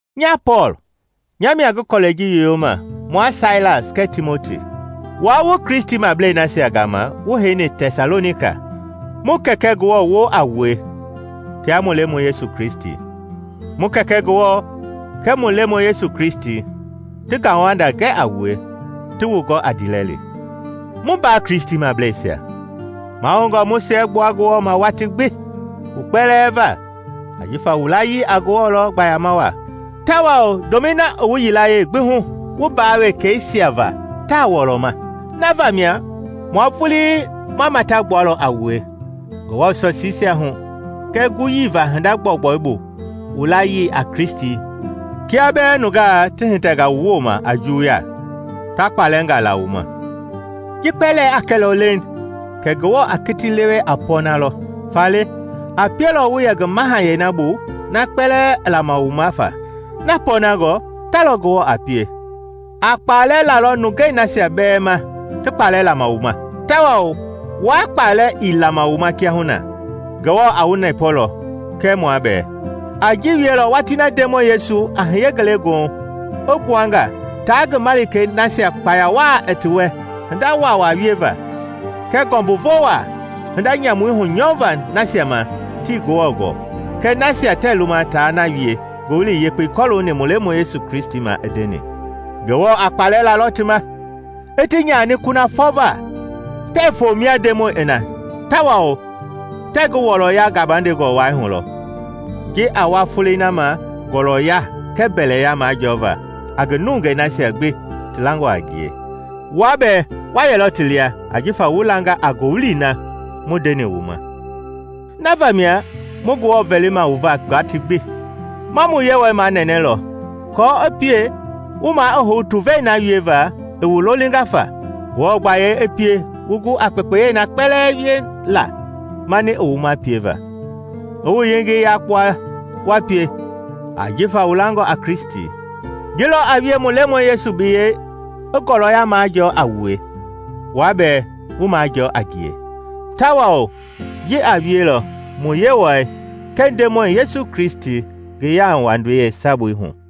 Nya Pɔɔl, nya mia ngi kɔlɛi ji yoyoma, mua Sailas kɛɛ Timoti. Wua wu Kristimablei nasia gama wu heini Tɛsalonika, mu Kɛkɛ Ngewɔ woo a wue tia mu Lemɔi Yesu Kristi. Mu Kɛkɛ Ngewɔ kɛɛ mu Lemɔi Yesu Kristi ti ngauwanda gɛ a wue, ti wu gɔ a ndiilɛli. Mu mbaa Kristimableisia, mahoungɔ mu siɛgbua Ngewɔ ma watii gbi wu kpɛlɛɛ va ajifa wu layii a Ngewɔ lɔ gbayama waa, tawao ndomɛi na i wu yilayee gbi hu wu mbaa wekɛisia va taa wɔlɔma. Na vamia mua vulii ma matagbualɔ a wue Ngewɔ sɔsiisia hu kɛɛ guyii va hinda gbɔugbɔu bu wu layii a Kristi kia bɛɛ nungaa ti hitɛnga wu wooma a juwuya, ta kpalɛngaa la wu ma. Ji kpɛlɛɛ a kɛlɔ leiŋ kɛ Ngewɔ a kiti lewe a pɔɔna lɔ, faale a pielɔ wu yɛ ngi mahayɛi na bu na kpalɛ i lama wu ma fa. Na pɔɔnangɔ ta lɔ Ngewɔ a pie: a kpalɛ lalɔ nungei nasia bɛɛ ma ti kpalɛ lama wu ma, tawao wua kpalɛ i lama wu ma kiahuna Ngewɔ a wu nɛpɔlɔ kɛɛ mua bɛɛ. A ji wielɔ watii na Ndemɔi Yesu a hiye ngelegoohu i gbua nga taa ngi malikei nasia kpaya waa i ti wɛ hinda waawaa wieva, kɛɛ ngɔmbuvo waa, hinda nyamui hunyɔva nasia ma tii Ngewɔ gɔɔ kɛɛ nasia tɛɛ luma taa na wie Ngowili Yekpei kɔlooni mu Lemɔi Yesu ma i ndeni. Ngewɔ a kpalɛ lalɔ ti ma, i ti nyani kunafɔ va, tɛɛ foo mia Ndemɔi i na tawao tɛɛ ngi wɔɔlɔya gabandengɔ wai hulɔ, ji a wa folei na ma ngɔɔlɔya kɛɛ mbɛlɛya majɔɔva a ngi nungei nasia gbi ti langɔ a ngie. Wua bɛɛ wa yɛlɔ ti lia ajifa wu langa a ngowili na mu ndeni wu ma. Na vamia mu Ngewɔ vɛlima wu va watii gbi. Ma mu Yewɔɛi manɛnɛlɔ aako i pie wu maa i hou tuvei na wieva i wu lolinga fa. Ngewɔ gbayei i pie wu gu a kpekpei na kpɛlɛɛ wiela mani i wu ma pieva, i wu yengei yakpua wa pie ajifa wu langɔ a Kristi. Ji lɔ a wie mu Lemɔi Yesu biyɛi i ngɔɔlɔya majɔɔ a wue, wua bɛɛ wu majɔɔ a ngie, tawao ji a wielɔ mu Yewɔɛi kɛɛ Ndemɔi Yesu Kristi ti yauwandei yeesabui hu.